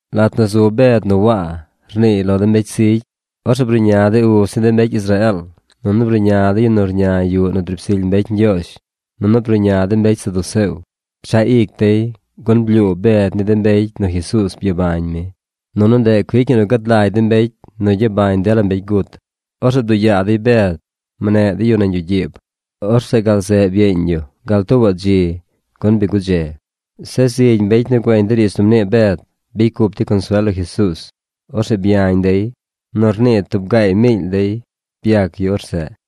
Lat nu zu Bed nu Waa, rniiy lo de mbecy zigy, orzeꞌ bruꞌña de uz ni de mbecy Israeel, nunu bruꞌña de yu nu rña yuꞌ nu driib zily mbecy Ñgyoozh, nunu bruꞌña de mbecy saduceo. Pchaꞌ ic dey, gun blyuu Bed ni de mbecy nu Jesuuz byabañ mi. Nunu ndeꞌ cuic ñi nu gad lagy de mbecy nu gyabañ dela mbecy gut. Orzeꞌ bduꞌ yaa dey Bed. Mneꞌ dey yu nañ yuꞌ gyiib. Orzeꞌ gal zeꞌ byeeñ yu gal tuubaꞌ dzi, gun bi gudze. Zeꞌ zigy mbecy nu güeñ de riidz nu mnii Bed, bicy cup dey consuel lo Jesuuz. Orzeꞌ byañ dey. Nu rnii tub gaay miily dey byac yu orzeꞌ.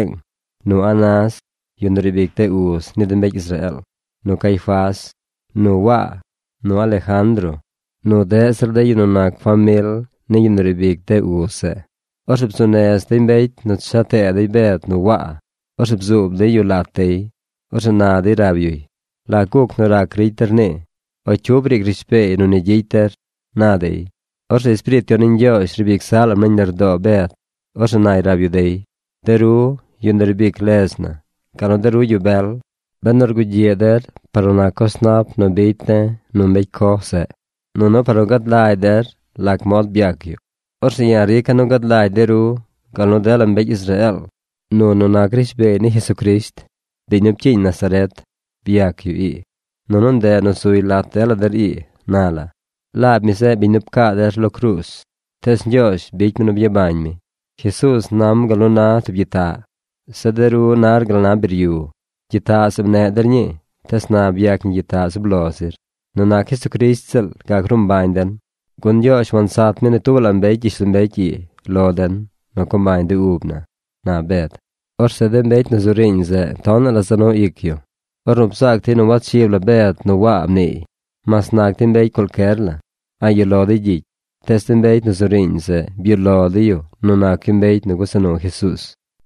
Byatublaazh dey Jerusaleeng nu Anás, yu nu riib ic de uz ni de mbecy Israeel, nu Caifás, nu Waa, nu Alejandro, nu deꞌ zir de yu nu nac famil ni yu nu riib ic de uz zeꞌ. Orzeꞌ bzuu nez dey mbecy nu cha tee dey Bed nu Waa. Orzeꞌ bzuub dey yu lat dey. Orzeꞌ na dey rab yuy: ―¿Lac guc nu rac ricy der nii?, o ¿cyu briic rishbeey nu ni gyicy der? ―na dey. Orzeꞌ Espiriit Yon ni Ñgyoozh riib ic zaꞌ lam nañ lardoo Bed. Orzeꞌ nay rab yu dey: ―De ru, yu nu riib ic ledz na, gal nu de ru yu bel, benu rgugyiꞌ der par nu nac coz nap nu bicy de̱ nu mbecy coj zeꞌ, nunu par nu gad lagy der lac mod byac yu, orzeꞌ ya̱ rica̱ nu gad lagy de ru gal nu dela mbecy Israeel nu nu nac rishbeey ni Jesucrisht, biñ nu pcyiiñ Nazaret, byac yu ii, nunu ndeꞌ nu zuy lat dela der ii na la. Laab mi zeꞌ biñ nu pcaa der lo cruuz. Tees Ñgyoozh bicy mi nu byabañ mi. Jesuuz nam gal nu na tub gyitaꞌ. Zeꞌ de ru nar gal na biryu. Gyitaꞌ zeꞌ mneꞌ der ñii, tees na byac ñi gyitaꞌ zub lo zir. Nu nac Jesucrisht ziꞌl gac ruu mbañ den, gun Ñgyoozh wansat mi ni tubaꞌ la mbecy gyishlombecy ii lo den nu co mbañ de ub na ―na Bed. Orzeꞌ de mbecy nu zu riiñ zeꞌ tonaꞌ la za nu ic yu, ornu bzaac dey nu wachib la Bed nu Waa mniiy, mas nac dey mbecy cualcyer la. A̱ꞌ yuꞌ lo dey gyicy. Tees de mbecy nu zu riiñ zeꞌ byuꞌ lo dey yu nu nac yu mbecy nu gusa nu Jesuuz.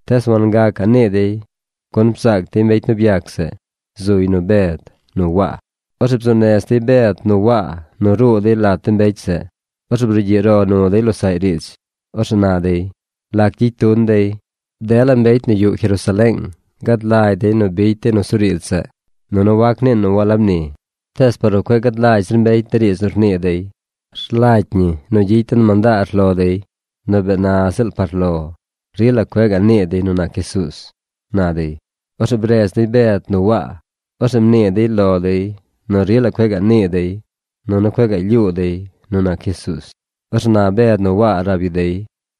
Tees wangacaꞌ nii dey gun bzaac dey mbecy nu byac zeꞌ. Zuy nu Bed nu Waa. Orzeꞌ bzuu nez dey Bed nu Waa nu ruu dey lat de mbecy zeꞌ. Orzeꞌ brugyiꞌ ro nu dey losaꞌy riidz. Orzeꞌ na dey: ―¿Lac gyicy tun dey? Dela mbecy nu yuꞌ Jerusaleeng gad lagy dey nu bicy dey nusuriidz zeꞌ nunu wac niin nu walab ni. Tees par nu cueꞌ gad lagy zir mbecy de riidz nu rnii dey, rlagy ñi nu gyicy den mandaar lo dey nu bee na ziꞌl par lo rila cueꞌ gaꞌ nii dey nu nac Jesuuz ―na dey. Orzeꞌ bredz dey Bed nu Waa. Orzeꞌ mnii dey lo dey nu rila cueꞌ gaꞌ nii dey, nunu cueꞌ lyuu dey nu nac Jesuuz. Orzeꞌ na Bed nu Waa rab yu dey: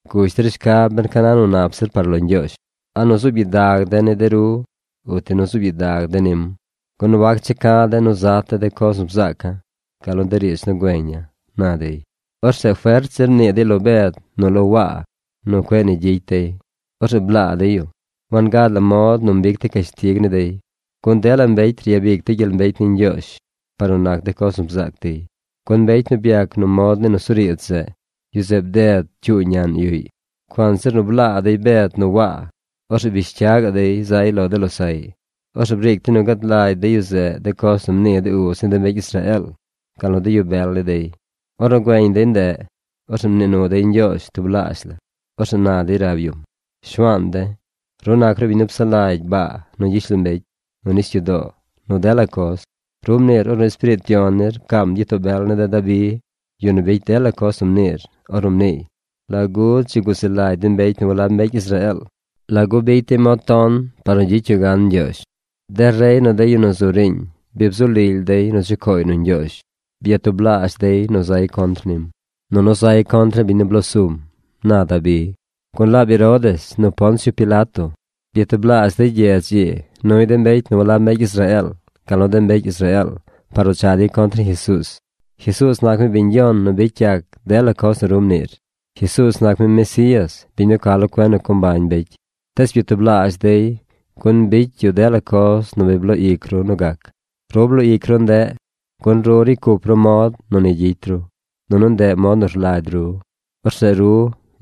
―Gush der shcab ben ca na nu nap zir par lo Ñgyoozh: a nu zuub gyidag de̱ ni de ru uti nu zuub gyidag de̱ nim. Gun wac checa̱ de̱ nu zat de̱ de coz nu bzaaca̱, gal nu de riidz nu güeña̱ ―na dey. Orzeꞌ fert zir mnii dey lo Bed nu lo Waa nu cueꞌ ni gyicy dey. Orzeꞌ blaa dey yu. Wangad la mod nu mbic dey cashtig ni dey, gun dela mbecy ryabic dey gyel mbecy ni Ñgyoozh par nu nac de coz nu bzaac dey, gun mbecy nu byac nu mod ni nusuriidz zeꞌ, yu zeꞌ bded cyuu ñaꞌn yuꞌy. Cuanzir nu blaa dey Bed nu Waa, orzeꞌ bish cya gaꞌ dey zay lo de losaꞌy. Orzeꞌ briic dey nu gad lagy de yu zeꞌ de coz nu mnii de uz ni de mbecy Israeel, gal nu de yu bel ni dey. Ornu güeñ dey ndeꞌ, orzeꞌ mnii nu dey Ñgyoozh tublaazh la. Orzeꞌ na dey rab yum: ―Shuaan de̱, ru nac ru biñ nu psaꞌ lagy baa nu gyishlombecy, nu nisyudoo, nu dela coz. Ru mniir ornu Espiriit Yon nir pcaam gyitoo bel ne̱ de̱ Dabi, yu nu bicy dela coz nu mniir, ornu mniiy: ¿Lagu dzi guzi lagy de mbecy nu walab mbecy Israeel? ¿Lagu bicy dey mod ton par nu gyicy yu gan Ñgyoozh? De rey nu de yu nu zu riiñ bi bzu lily dey nu chucooy nu Ñgyoozh. Byatublaazh dey nu zay contr nim, nunu zay contr ni biñ nu bloo sum, na Dabi. ’Gun laab Herodes nu Poncio Pilato byatublaazh dey gyedz ii nuy de mbecy nu walab mbecy Israeel, gal nu de mbecy Israeel par nu cha dey contr ni Jesuuz. Jesuuz nac mi biñ Yon nu bicy yac dela coz nu ru mniir. Jesuuz nac mi Mesías, biñ nu ca lo cuen nu co mbañ mbecy. Tees byatublaazh dey gun bicy yu dela coz nu bi bloo ic ru nu gac. Ru bloo ic ru ndeꞌ, gun ru ricy cup ru mod nu ni gyicy ru, nunu ndeꞌ mod nu rlagy ru. Orzeꞌ ru,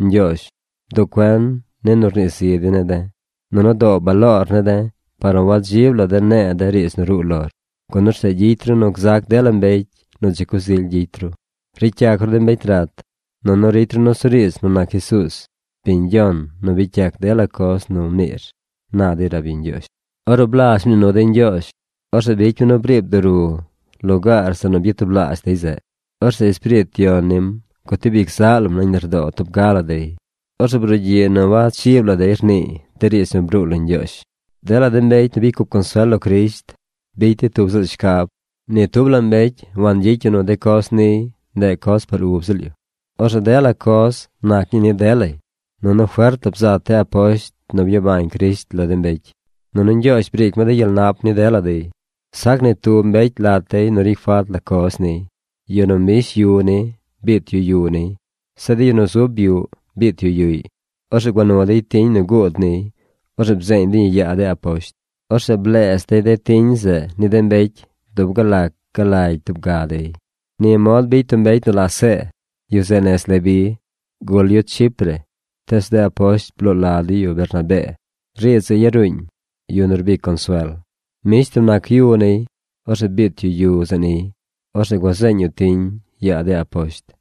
Ñgyoozh, bduꞌ cuen ni nu rnii zi dey ne̱ de̱, nunu doo baloor ne̱ de̱ par nu wadzib la de̱ ne̱e̱ de riidz nu ruu lor. Gun orzeꞌ gyicy ru nu gzac dela mbecy nu dzi coz ily gyicy ru. Ricy yac ru de mbecy rat, nunu ricy ru nusuriidz nu nac Jesuuz, biñ Yon nu bicy yac dela coz nu mniir ―na dey rab yu Ñgyoozh. Ornu blazh mnii nu dey Ñgyoozh, orzeꞌ bicy mi nu briib duru lugaar zeꞌ nu byatublaazh dey zeꞌ. Orzeꞌ Espiriit Yon nim gutib ic zaꞌ lam nañ lardoo tub ga la dey. Orzeꞌ brugyiꞌ nu wachib la dey rniiy de riidz nu bruu lo Ñgyoozh. Dela de mbecy nu bicy cup consuel lo Crisht bicy dey tub ziꞌl shcab. Ni tub la mbecy wangyicy yu nu de coz niy, ndeꞌ coz par ub ziꞌl yu. Orzeꞌ dela coz nac ñii ni delay. Nunu fert la bzat de aposht nu byabañ Crisht lo de mbecy. Nunu Ñgyoozh briic mi de gyel nap ni dela dey. Sac ni tub mbecy lat dey nu ricy falt la coz niy. De yu nu mbish yu ni, biit yu yu niy. Zeꞌ de yu nu zub yuꞌ, biit yu yuꞌy. Orzeꞌ gua nu dey tiñ nu guud niy. Orzeꞌ bzeeñ dey ñi yaa de aposht. Orzeꞌ bleez dey de tiñ zeꞌ ni de mbecy dub gal lac ga lagy tub ga dey. Ni mod bicy tub mbecy nu la See. Yu zeꞌ nez Leví. Gul yu Chipre, tees de aposht bloo la dey yu Bernabee. Riidz zeꞌ yaruuñ: Yu nu rbic consuel. Mbish tub nac yu niy. Orzeꞌ biit yu yu zeꞌ niy. Orzeꞌ gua zeeñ yu tiñ yaa de aposht.